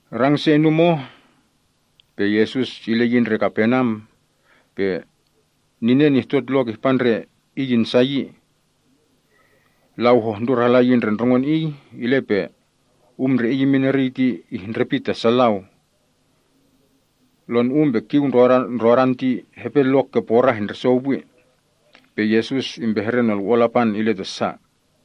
Rang se inum oh, pe Yesus ile yi ndre Kaperneam, pe ninen ihtot lok ihpa ndre Iy insa yi. Lau hohndur hala yi ndre ndrongon Iy, ile pe um ndre Iy imin eriy ti ihndrepit ta sa lau. Lonu‑um pe kiu ndrodan ti hepe lok ke porah indrisou pwi, pe Yesus impehre Nolwo‑on Lapan ile ta sa.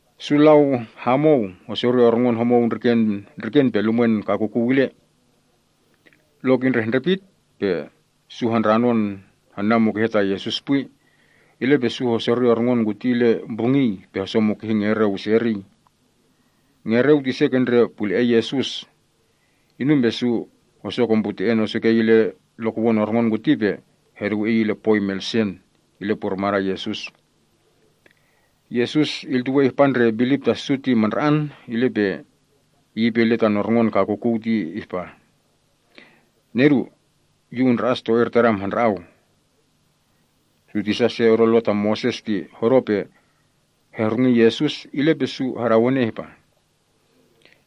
Su lau hamou hosori orngon homou ndriken pe lumwen kakukuw ile. Lok indrehndrepit pe su handranon hana mukehe ta Yesus pwi, ile pe su hosori orngon kuti ile mbrungiy pe hosomukihi ngereu ise eriy. Ngereu ti ise ke ndre pule‑en Yesus. Inum pe su hosokombrute‑en osukei ile lokowon orngon kuti pe heduwe iy ile pwoi melsen, ile purmadan Yesus. Yesus iltuwei ihpa ndre bilip ta su ti mandra‑an, ile pe Iy ipe ile tan orngon kakukuw ihpa, “Nedu, Yu undra‑as to-ir tadam handra‑au.” Su tisa se odo Lo ta Moses ti hodo pe hehrungi Yesus, ile pe su hadawene ihpa,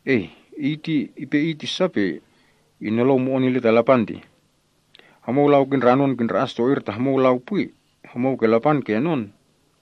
“Ei! Iy ti ipe Iy ti sa pe inolou mo‑on ile ta Lapan tih? Homou lau kindranon kindra‑as to-ir ta homou lau pwi. Homou ke Lapan kenon kipu ertih!”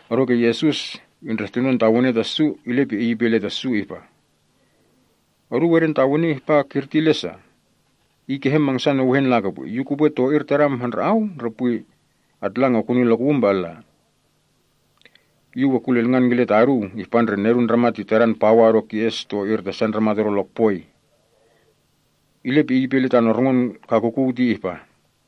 Odoke Yesus indrehtunon tawene ta su, ile pe Iy ipe ile ta su ihpa, “Oduu edentawene ihpa kirti ile sa? Iy kehe mangsan ewehen lakopwi? Yu kupwe ‘to‑ir tadam handra‑au’ ndre pwi Yu kupwe ‘atlang, okuni lokowum pe alla’? Yu we kulilngan kile ta oduu ihpa ndre Nedun Ndramat ti tadan pawa odo as to‑ir ta sa ndramat odo lokpoi.” Ile pe Iy ipe ile tan orngon kakukuw ti ihpa,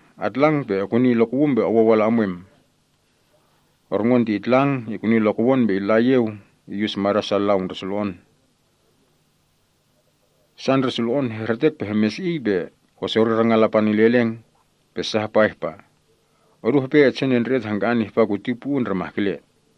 “Atlang, ekuni lokum pe owou ala emwem!” Orngon ti itlang, ikuni lokowon, pe illa iyeu iyus mada’ sa lau ndre sulo‑on. Sa ndre sulo‑on hehretek pe hemesi‑iy, pe hesori rangan Lapan ile eleng. Pe sa hapa ihpa, “Odu hepe etsenendre‑et hangka‑an ihpa kuti pwi uu ndre mahkele.”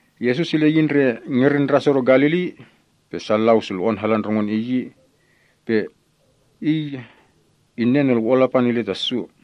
Yesus ile yi ndre ngerin ndras odo Galili. Sa lau sulo‑on hala ndrongon Iy, pe Iy innen Nolwo‑on Lapan ile ta su.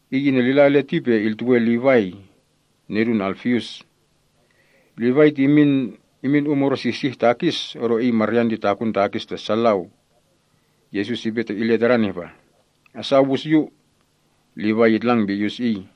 Iy inelila ile ti pe iltuwe Livai, taman ti Alfius. Livaia ti imin um odo sihsih takis, odosa iy maryan ti takun takis ta sa lau. Yesus ipe ile tadan ihpa, “Asa owus Yu.” Livai itlang pe iyus Iy.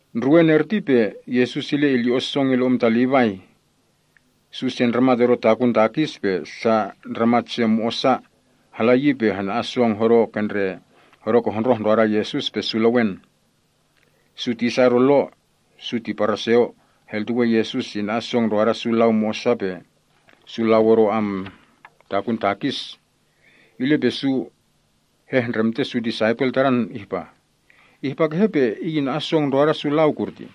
Ndruwen erti pe Yesus ile ilyo‑on song ile um ta Livai. Su se ndramat odo takun takis pe sa ndramat se mo‑osa, hala yi pe hana‑an song hodo ke hondroh ndroda Yesus pe su lewen. Su tisa odo Lo (su ti Paraseo) heltuwe Yesus ina‑an song ndroda sa lau mo‑osa pe su lau odo takun takis, ile pe su hehndremte su disaipel Tadan ihpa, “Ihpa kehe pe Iy ina‑an song ndroda sa lau kurtih?”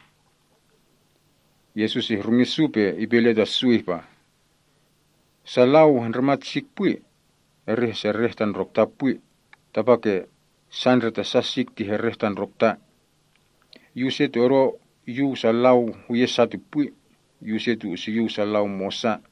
Yesus ihrungi su pe ipe ile ta su ihpa, “Sa lau hendrimat sik pwi ti hesereh tan ndrokta pwi, tapake sa ndre ta sa sik ti herreh tan ndrokta. Yu use ti odo yuw sa lau huye’ sa ti pwi. Yu use ti usuyuw sa lau mo‑osa.”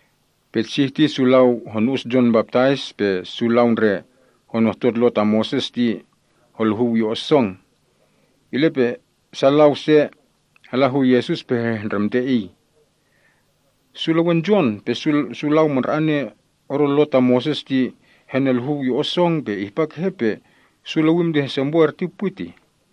Petsih ti su lau honu‑us Jon Baptais, pe su lau ndre honohtot Lo ta Moses, eri holuhuw yo‑on song. Ile pe sa lau se hala hu Yesus pe hehndremte Iy, “Su lewen Jon pe su lau mandra‑ane odo Lo ta Moses ti heneluhuw yo‑on song, pe ihpa kehe pe su lewim ti hesempo erti pwi tih?”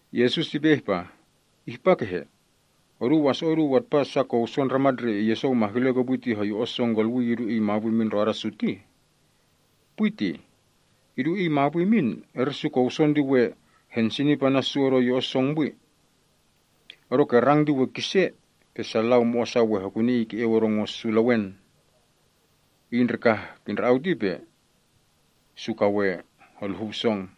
Yesus ipe ihpa, “Ihpa kehe? Oduu waso‑o’ oduu atpa sa kowson ndramat ndre iyesou mahkele kopwi ti hoyo‑on song kolwii, idu iy mapwi imin ndroda su tih? Pwi tih! Idu iy mapwi imin, eri su kowson ti we hensinip ana’ su odo yo‑on song pwi. Odoke rang ti we kise, pe sa lau mo‑osa we hekuni iy ke‑eu odo ngo’ su lewen. Iy ndre kah kindra‑au ti pe su ka we holuhuw song.”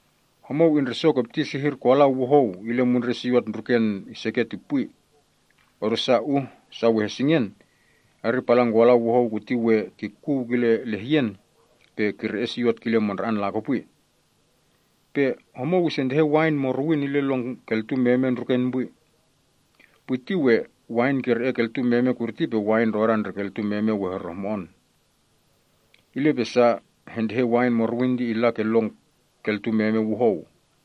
“Homou indresokopti sehir kolau wuhou ile mundren siot ndruken iseket ti pwi, odosa, uh sa we hesingen, eri palan kolau wuhou kuti we kikuw kile lehyen pe kire‑e siot kile mandra‑an lakopwi. Pe homou isentehen wain morowin ile lon keltun meme ndruken pwi. Pwi ti we wain kire‑e keltun meme kurti, pe wain ndrodan ndre keltun meme we herehmo‑on. Ile pe sa hentehen wain morowin ti illa ke lon kalatun meme wuhou.”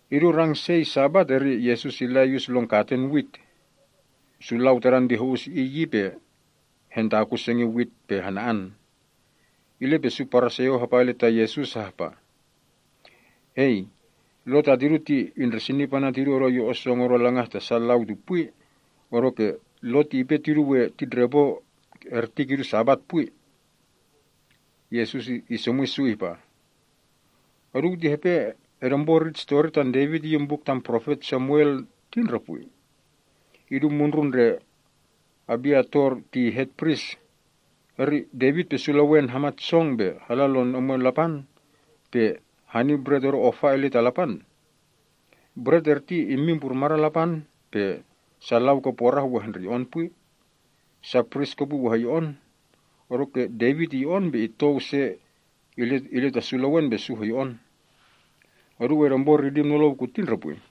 Idu rang sei Sabat eri Yesus illa iyus lon katen wit. Su lau Tadan ti ho‑us Iy yi, pe hentakun sengin wit pe hana‑an. Ile pe su Paraseo hapa ile ta Yesus hahpa, “Hei, Lo ta tidu ti indresinip ana’ tidu odo yo‑on song odo langah ta sa lau ti pwi, odoke Lo ti ipe tidu we titndrepo erti kidu Sabat pwi.” Yesus isomwi su ihpa, “Oduu ti hepe edempo rit pohtidi‑iy tan Devit iyin buk tam Profet Samuel ti ndre pwi? Idu mundrun ndre Abiatar ti hetpris, Devit pe su lewen hamat song pe hala lon omwen Lapan, pe hani bret odo ofa illa ta Lapan. Bret erti immin purmadan Lapan, pe sa lau ke porah we hendreyo‑on pwi. Sa pris kopwi we heyo‑on. Odoke Devit iyo‑on, pe itou se ile ana’ su lewen yi. Oduu edempo ridim nolou kuti ndre pwi?”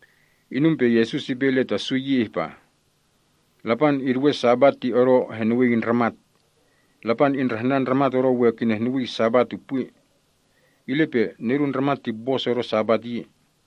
Inum pe Yesus ipe ile ta su yi ihpa, “Lapan iduwe Sabat ti odo henuwii ndramat. Lapan indrahnan ndramat odo we kinehnuwii Sabat ti pwi. Ile pe Nedun Ndramat ti bos odo Sabat yi.”